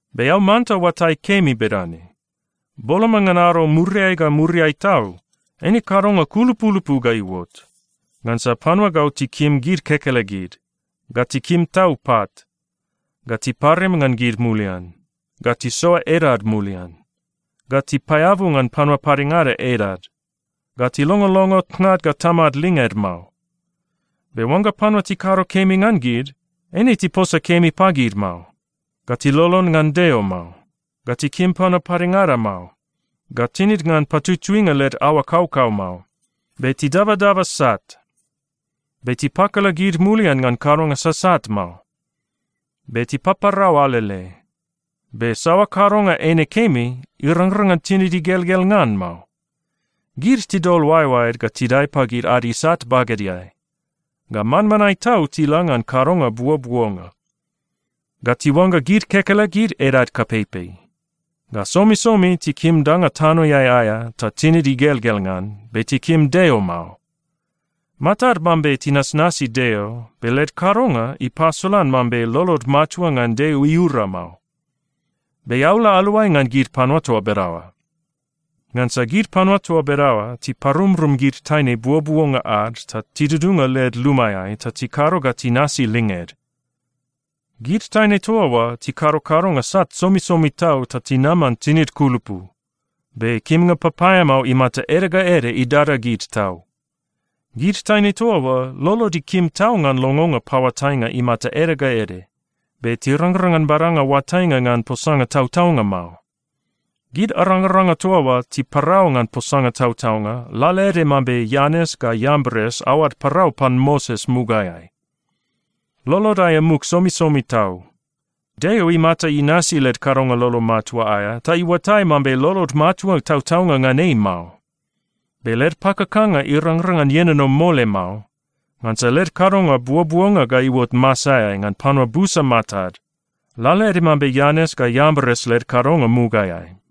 Be eao manta oatai kemi bedane: Boloma ngan ado muriai ga muriai tau, eine kadonga kulupulupu ga iuot. Ngansa panua gau tikim gid kekelegid. Ga tikim tau pat. Ga tiparim ngan gid mulian. Ga tisoa edad mulian. Ga tipaeabu ngan panua padengada edad. Ga tilongolongo tnad ga tamad linged mao. Be oangga panua tikado kemi ngan gid, eine tiposa kemi pagid mao. Ga tilolon ngan Deo mao. Ga tikim panua padengada mao. Ga tinid ngan patutuinga led aoa kaukau mao. Be tidabadaba sat. Be tipakala gid mulian ngan kadonga sasat mao. Be tipaparau alele. Be saoa kadonga eine kemi, irangrang ngan tinid igelgel ngan mao. Gid tidol oaeoaed ga tidae pagid ad isat bagedeai. Ga manmanae tau tila ngan kadonga buobuonga. Ga tiuangga gid kekelegid edad kapeipei. Ga somisomi tikim danga tanoeai aea ta tinid igelgel ngan, be tikim Deo mao. Matad mambe tinasnasi Deo, be led kadonga ipasolan mambe lolod matua ngan Deo iura mao. Be eao la aluai ngan gid panua toa bedaoa. Ngansa gid panua toa bedaoa tiparumrum gid taine buobuonga ad ta tidudunga led lumaeai ta tikado ga tinasi linged. Gid taine toa oa tikado kadonga sat somisomi tau ta tinaman tinid kulupu, be kimnga papaeamao imata ede ga ede idada gid tau. Gid taine toa oa lolod ikim tau ngan longonga paoatainga imata ede ga ede, be tirangrang ngan badanga oatainga ngan posanga tautaunga mao. Gid arangaranga toa oa tiparau ngan posanga tautaunga lalaede mambe Ianes ga Iambres aoad parau pan Moses mugaeai. Lolod aea muk somisomi tau. Deo imata inasi led kadonga lolo matua aea ta iuatai mambe lolod matua tautaunga ngan ei mao. Be led pakakanga irangrang ngan ienono mole mao, ngansa led kadonga buobuonga ga iuot masaeai ngan panua busa matad, lalaede mambe Ianes ga Iambres led kadonga mugaeai.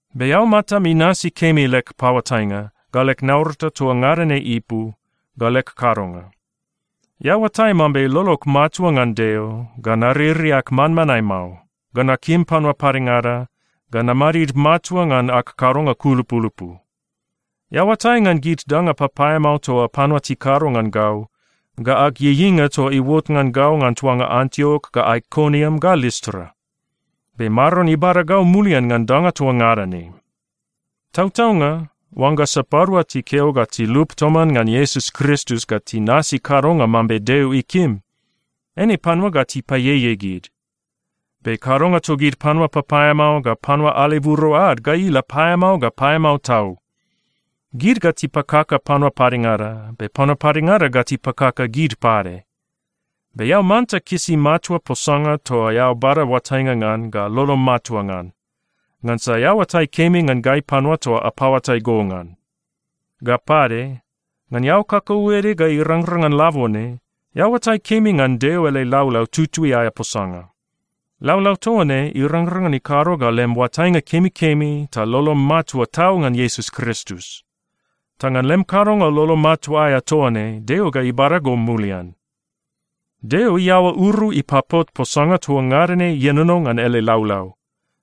Be eao matam inasi kemi leg paoatainga, ga leg naurata toa ngada ne ipu, ga leg kadonga. Eao oatai mambe lolog matua ngan Deo, ga naririak manmanae mao, ga nakim panua padengada, ga namadid matua ngan ag kadonga kulupulupu. Eao oatai ngan gid danga papaeamao toa panua tikado ngan gau, ga ag ieieinga toa iuot ngan gau ngan tuanga Antiok ga Aikoniam ga Listra. Be Maron ibada gau mulian ngan danga toa ngada ne. Tautaunga, oangga sapadua tikeo ga tilup toman ngan Iesus Kristus ga tinasi kadonga mambe Deo ikim, eine panua ga tipaieiei gid. Be kadonga togid panua papaeamao ga panua aleburo ad ga ila paeamao ga paeamao tau. Gid ga tipakaka panua padengada, be panua padengada ga tipakaka gid pade. Be eao manta kisi matua posanga toa eao bada oatainga ngan ga lolom matua ngan, ngansa eao oatai kemi ngan gai panua toa apaoatai go ngan. Ga pade, ngan eao kakauede ga irangrang ngan labone, eao oatai kemi ngan Deo ele laulau tutui aea posanga. Laulau toa ne irangrang ngan ikado ga lem oatainga kemikemi ta lolom matua tau ngan Iesus Kristus. Ta ngan lem kadonga lolo matua aea toa ne Deo ga ibada go mulian. Deo iaoa uru ipapot posanga toa ngada ne ienono ngan ele laulau,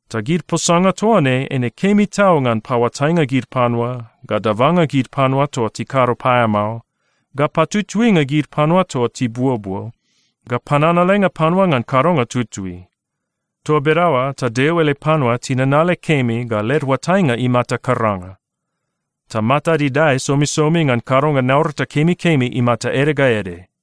ta gid posanga toa ne eine kemi tau ngan paoatainga gid panua, ga dabanga gid panua toa tikado paeamao, ga patutuinga gid panua toa tibuobuo, ga pananalenga panua ngan kadonga tutui. Toa bedaoa ta Deo ele panua tinanale kemi ga led oatainga imata karanga. Ta matad idae somisomi ngan kadonga naurata kemikemi imata ede ga ede.